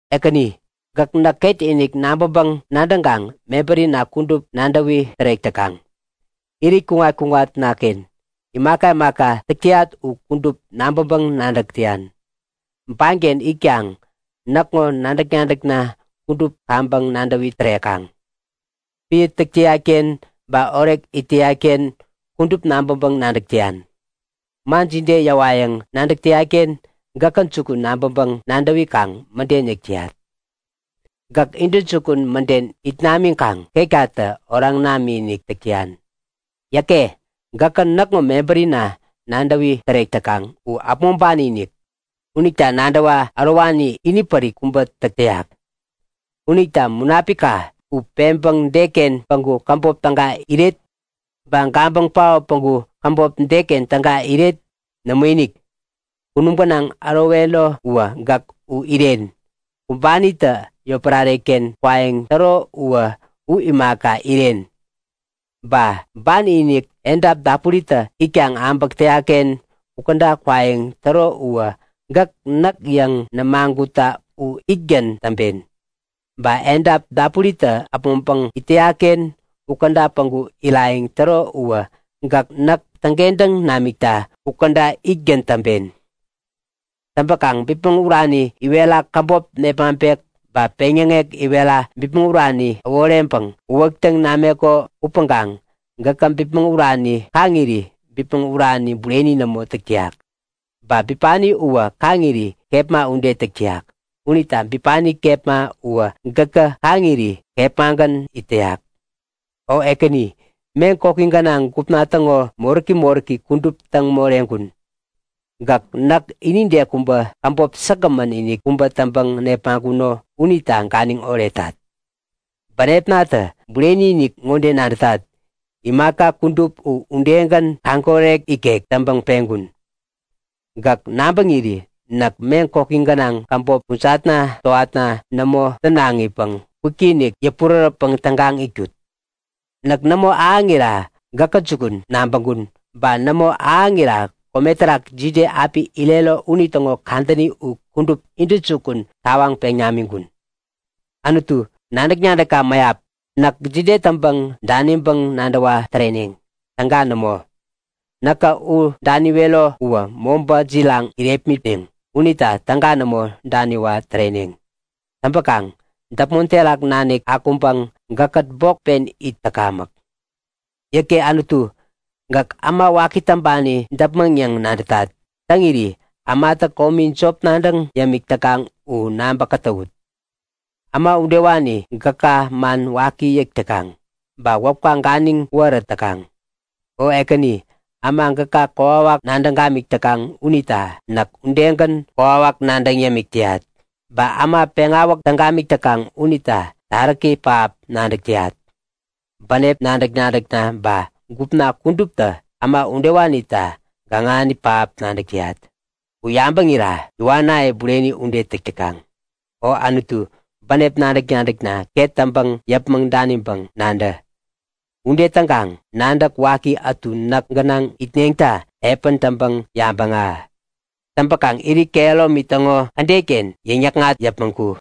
Ekäni, gäk näk ket-inik nabäŋpäŋ-nadäŋkaŋ mebärina kudup nadäwi tärek täkaŋ. Irit kuŋat-kuŋatnaken imaka imaka täk täyat u kudup nabäŋpäŋ-nadäk täyan. Banken itkaŋ näkŋo nadäk-nadäkna kudup kaŋpäŋ nadäwi tärekaŋ. Piä täk täyatken ba orek it täyatken kudup nabäŋpäŋ-nadäk täyan. Man jide yäwayäŋ nadäk täyatken gäkä jukun nabäŋpäŋ-nadäwikaŋ mäden yäk täyat. Gäk intäjukun mäden it namiŋkaŋ ketkatä oraŋ namikinik täk täyan. Yäke! Gäkä näkŋo mebärina nadäwi tärek täkaŋ u äpmoŋpani-inik. Unita nadäwa ärowani inipärik kubä täk täyak. Unita Munapikka u peŋpäŋ deken päŋku käbop täga iret? Ba gabäŋ paot päŋku käbop deken täga iret? Nämoinik! Kunum gänaŋ ärowero uwä gäk u iren. Kumbanitä yotpärareken kwayäŋ täro uwä u imaka, iren. Ba ban-inik, edap dapuritä itkaŋ abäk täyakken ukäda kwayäŋ täro uwä gäk näk yäŋ-nämagutta u itgän täŋpen. Ba edap dapuritä äpmoŋpäŋ it täyakken ukäda päŋku irayäŋ täro uwä gäk näk täŋkentäŋ namikta ukäda itgän täŋpen. Täŋpäkaŋ bipmäŋ urani iwera käbop nepmaŋpek, ba peŋyäŋek iwera bipmäŋ urani äworeŋpäŋ uwäktäŋ nameko upäŋkaŋ gäkä bipmäŋ urani kaŋiri bipmäŋ urani bureni nämo täk täyak. Ba bipani uwä kaŋiri kepma ude täk täyak. Unita bipani kepma uwä gäkä kaŋiri kepmagän it täyak. O Ekäni, meŋ koki gänaŋ gupna täŋo moräki moräki kudup täŋ moreŋkun. Gäk näk inide kubä käbop säkgämän-inik kubä täŋpäŋ nepmaŋkuno unita ganiŋ oretat. Bänepnatä bureni-inik ŋode nadätat; Imaka kudup u udegän kaŋkorek ikek täŋpäŋ peŋkun. Gäk nabäŋiri näk meŋ koki gänaŋ käbop kujatna tohatna nämo tänaŋipäŋ kwikinik yäpurärätpäŋ tägaŋ itkut. Näk nämo ahäŋira gäkä jukun nabäŋkun. Ba nämo ahäŋira kome terak jide api irero unitäŋo kadäni u kudup intäjukun tawaŋ peŋ namiŋkun. Anutu, nadäk-nadäkka mäyap. Näk jide täŋpäŋ daniŋpäŋ nadäwa täreneŋ. Täga nämo! Näkä u daniwero uwä mobä jiraŋ irepmitneŋ, unita täga nämo daniwa täreneŋ! Täŋpäkaŋ däpmon terak nanik akuŋpäŋ gäkkät bok pen it täkamäk. Yäke! Anutu, gäk äma waki täŋpani däpmäŋ yäŋ nadätat! Täŋiri ämata komi jop nadäŋ yämik täkaŋ u nabä-kätäwut! Äma udewani gäka man waki yäk täkaŋ. Ba wäpka ganiŋ wärät täkaŋ. O Ekäni, äma gäka kokwawak nadäŋ gamik täkaŋ unita näk udegän kokwawak nadäŋ yämik täyat. Ba äma peŋawäk täŋ gamik täkaŋ unita taräki pähap nadäk täyat. Bänep nadäk-nadäkna ba gupna kuduptä äma udewanita gaŋani pähap nadäk täyat. U yabäŋira iwanaye bureni ude täk täkaŋ. O Anutu, bänep nadäk-nadäkna ket täŋpäŋ yäpmäŋ daniŋpäŋ nadä. Ude täŋkaŋ nadäk waki ätu näk gänaŋ itneŋta epän täŋpäŋ yabäŋ ahä. Täŋpäkaŋ irit kehäromi täŋo kädetken yäŋnäkŋat yäpmäŋ ku!